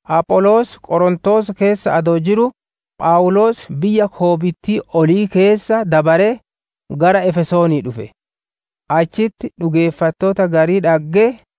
Apholoos Qorontoos keessa adoo jiruu, Phawuloos biyya koobittii olii keessa dabaree, gara Efesoonii dhufe; achitti dhugeeffattoota garii dhaggee,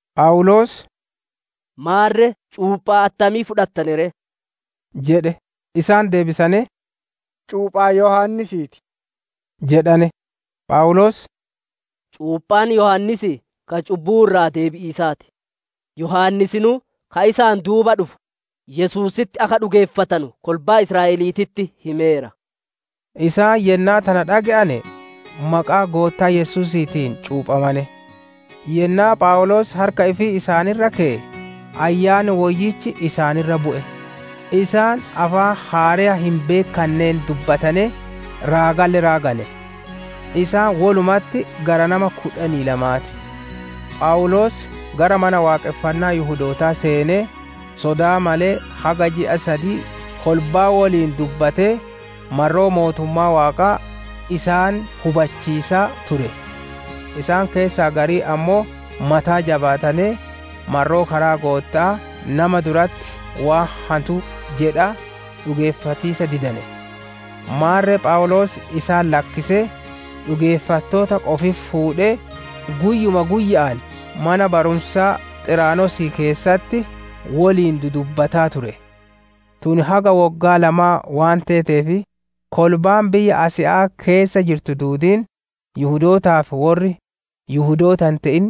Phawuloos, «Maarre cuuphaa attamii fudhattane ree?» jedhe. Isaan deebisanee, «Cuuphaa Yohaannisii ti» jedhane. Phawuloos, «Cuuphaan Yohaannisii ka cubbuu irraa deebi'iisaa ti; Yohaannisinuu ka isaan duuba dhufu, Yesuusitti akka dhugeeffatanu kolbaa Israa'eliititti himeera» jedhe. Isaan yennaa tana dhage'ane, maqaa Goottaa Yesuusiitiin cuuphamane. Yennaa Phawuloos harka ifii isaan irra keye, Ayyaanni Woyyichi isaan irra bu'e; isaan afaan haareya hin beekkanneen dubbatanee, raagalle raagane. Isaan wolumatti gara nama kudhanii lamaa ti. Phawuloos gara Mana Waaqonfannaa Yihudootaa seenee, sodaa malee haga ji'a sadii kolbaa woliin dubbatee, marroo mootummaa Waaqaa isaan hubachiisaa ture. Isaan keessaa gariin ammoo mataa jabaatanee, marroo karaa Gootta'aa nama duratti waan hantuu jedhaa, dhugeeffatiisa didane. Maarre Phawuloos isaan lakkisee, dhugeeffattoota qofitti fuudhee, guyyuma guyya'aan mana barumsa Xiraanosii keessatti woliin dudubbataa ture. Tun haga woggaa lamaa waan teeteef, kolbaan biyya Asiya'aa keessa jirtu duudiin Yihudootaa fi worri Yihudoota hin te'in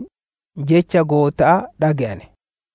Jecha Gootta'aa dhage'ane.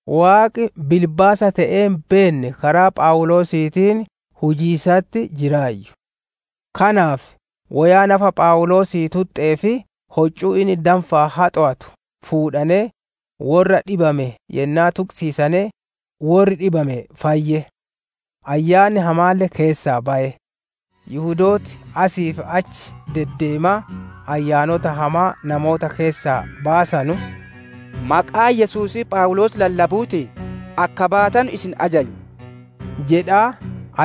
Waaqi bilbaasa te'ee hin beenne karaa Phawuloosiitiin hujiisatti jiraayyu. Kanaaf woyaa nafa Phawuloosii tuxxee fi hoccuu inni danfaan haxowatu fuudhanee, worra dhibame yennaa tuqisiisane, worri dhibame fayye; ayyaanni hamaalle keessaa baye. Yihudooti asii fi achi deddeemaa ayyaanota hamaa namoota keessaa baasanu, «Maqaa Yesuusii Phawuloos lallabuutiin akka baatanu isin ajanya» jedhaa,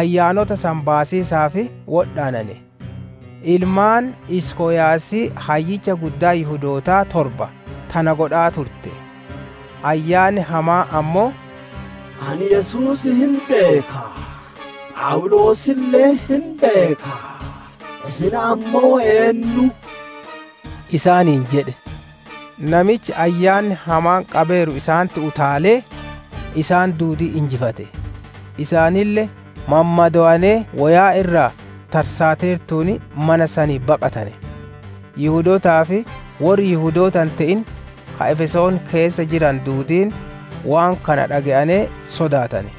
ayyaanota san baasiisaaf wodhaanane. Ilmaan Iskoyaasii hayyicha Guddaa Yihudootaa torba tana godhaa turte. Ayyaanni hamaan ammoo, «Ani Yesuus hin beeka; Phawuloosille hin beeka; isin ammoo eennu?» isaaniin jedhe. Namichi ayyaanni hamaan qabeeru isaanitti utaalee, isaan duudii injifate; isaanille mammadowanee woyaan irraa tarsaateertuun mana sanii baqatane. Yihudootaa fi worri Yihudoota hin te'in ka Efesoon keessa jiranu duudiin, waan kana dhage'anee sodaatane;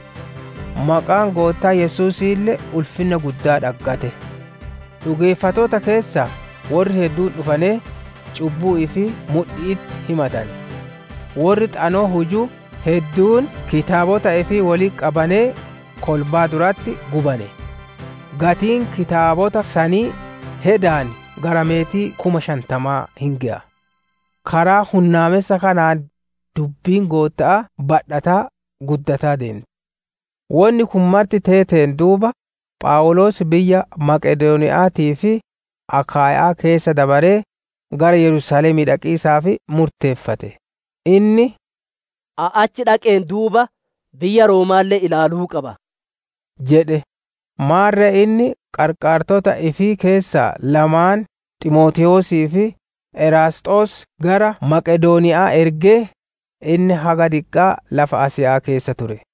maqaan Goottaa Yesuusiille ulfinna guddaa dhaggate. Dhugeeffattoota keessaa worri hedduun dhufanee, cubbuu ifii mudhi'itti himatane. Worri Xanoo huju hedduun kitaabota ifii wolitti qabanee, kolbaa duratti gubane. Gatiin kitaabota sanii hedaan gara meetii kuma shantamaa hin geya. Karaa hunnaamessa kanaan dubbiin Gootta'aa badhataa, guddataa deente. Wonni kun marti teeteen duuba, Phawuloos biyya Maqedooniya'aatii fi Akaaya'aa keessa dabaree, gara Yerusaalemii dhaqiisaaf murteeffate; inni, «Ani achi dhaqeen duuba, biyya Rooma'aalle ilaaluu qaba» jedhe. Maarre inni qarqaartota ifii keessaa lamaan Ximootewoosii fi Eraasxoos gara Maqedooniya'aa ergee, inni haga diqqaa lafa Asiya'aa keessa ture.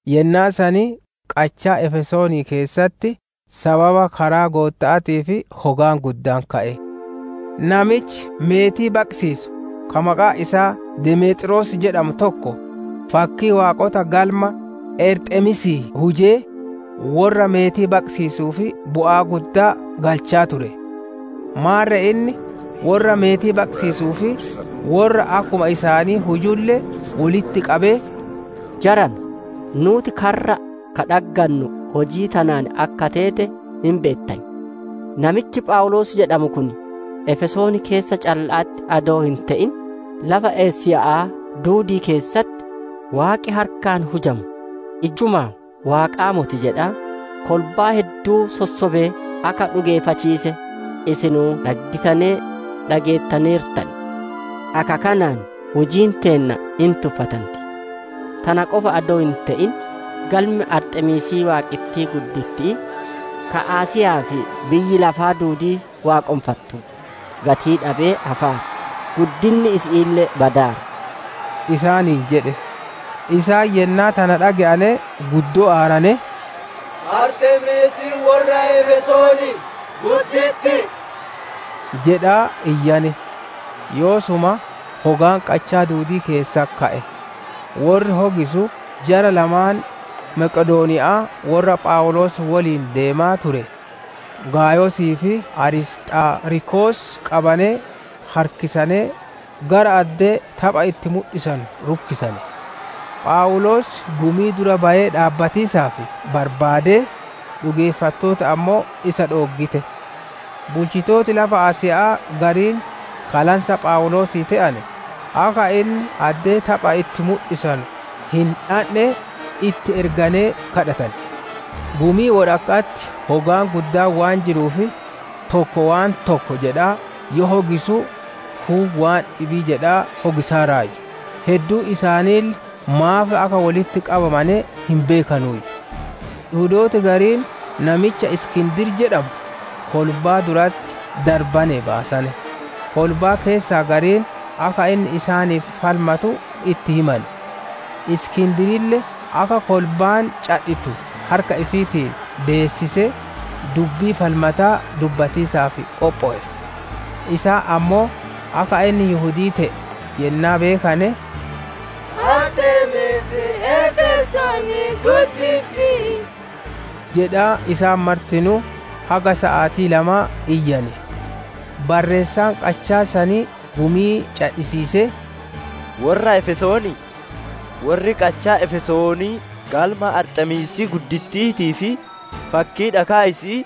Yennaa san qachaa Efesoonii keessatti sababa karaa Gootta'aatiif hogaan guddaan ka'e. Namichi meetii baqisiisuu ka maqaan isaa Demeexroos jedhamu tokko, fakkii waaqota galma Arxemiisii hujee, worra meetii baqisiisuuf bu'aa guddaa galchaa ture. Maarre inni worra meetii baqisiisuu fi worra akkuma isaanii hujulle wolitti qabee, «Jarana, nuuti karra ka dhaggannu hujii tanaan akka teete hin beettan. Namichi Phawuloos jedhamu kun Efesoon keessa calla'atti adoo hin te'in, lafa Asiya'aa duudii keessatti, waaqi harkaan hujamu ijjumaa waaqaa moti jedhaa, kolbaa hedduu sossobee akka dhugeeffachiise, isinuu dhaggitanee dhageettaneertan. Akka kanaan hujiin teenna hin tuffatanti; tana qofa adoo hin te'in galmi Arxemiisii waaqittii gudditti'ii ka Asiya'aa fi biyyi lafaa duudiin waaqonfattu gatii dhabee hafaara; guddinni isi'iille badaara» isaaniin jedhe. Isaan yennaa tana dhage'ane guddoo aaranee, «Arxemiisiin worra Efesoonii gudditti'i!» jedhaa iyyane. Yoosuma hogaan qachaa duudii keessatti ka'e. Worri hogisu jara lamaan Maqedooniya'aa worra Phawuloos woliin deemaa ture Gaayosii fi Arisxaarkos qabanee harkisanee, gara addee tapha itti mudhisanu rukkisane. Phawuloos gumii dura bayee dhaabbatiisaaf barbaadee, dhugeeffattooti ammoo isa dhooggite. Bulchitooti lafa Asiya'aa gariin ka lansa Phawuloosii te'ane, akka inni addee tapha itti mudhisanuu hin dhandhe, itti erganee kadhatane. Gumii wodhakka'atti hogaan guddaan waan jiruuf, tokko waan tokko jedhaa yoo hogisu, kuun waan dhibii jedhaa hogisaaraayyu; hedduun isaaniille maaf akka wolitti qabamane hin beekanuuyyu. Yihudooti gariin namicha Iskindir jedhamu kolbaa duratti darbanee baasane; kolbaa keessaa gariin akka inni isaaniif falmatu itti himane. Iskindirille akka kolbaan cadhittu harka ifiitiin beessisee, dubbii falmataa dubbatiisaaf qophowe. Isaan ammoo akka inni Yihudii te'e yennaa beekane, «Arxemiisiin Efesoonii gudditti'ii» jedhaa isaan martinuu haga saatii lama iyyane. Barreessaan qachaa sanii gumii cadhisiisee, «Worra Efesoonii! Worri qachaa Efesoonii galma Arxemiisii gudditti'iitii fi fakkii dhakaa isi'ii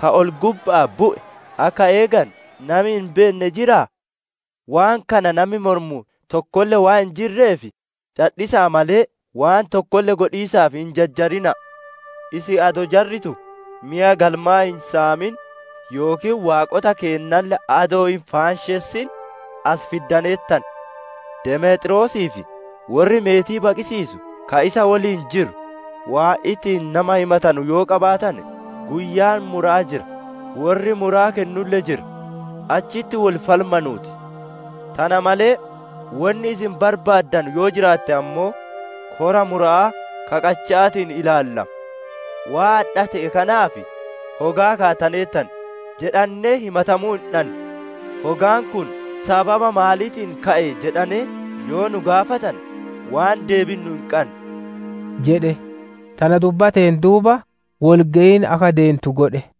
ka ol-gubba'aa bu'e akka eeganu, nami hin beenne jiraa? Waan kana nami mormu tokkolle waan hin jirreef, cadhisa'a malee waan tokkolle godhiisaaf hin jajjarina'a. Isin adoo jarri tun meya galmaa hin saamin yookiin waaqota keennalle adoo hin faanshessin as fiddaneertan. Demeexroosii fi worri meetii baqisiisu ka isa woliin jiru, waan ittiin nama himatanu yoo qabaatane, guyyaan mura'aa jira; worri muraa kennulle jira; achitti wol falmanuu ti. Tana malee, wonni isin barbaaddanu yoo jiraatte ammoo, kora mura'aa ka qacha'aatiin ilaallama. Waan adha te'e kanaaf, hogaa kaattaneertan jedhannee himatamuu hin dhannu; hogaan kun sababa maaniitiin ka'e jedhane yoo nu gaafatane, waan deebinnu hin qannu» jedhe. Tana dubbateen duuba, wol geyin akka deentu godhe.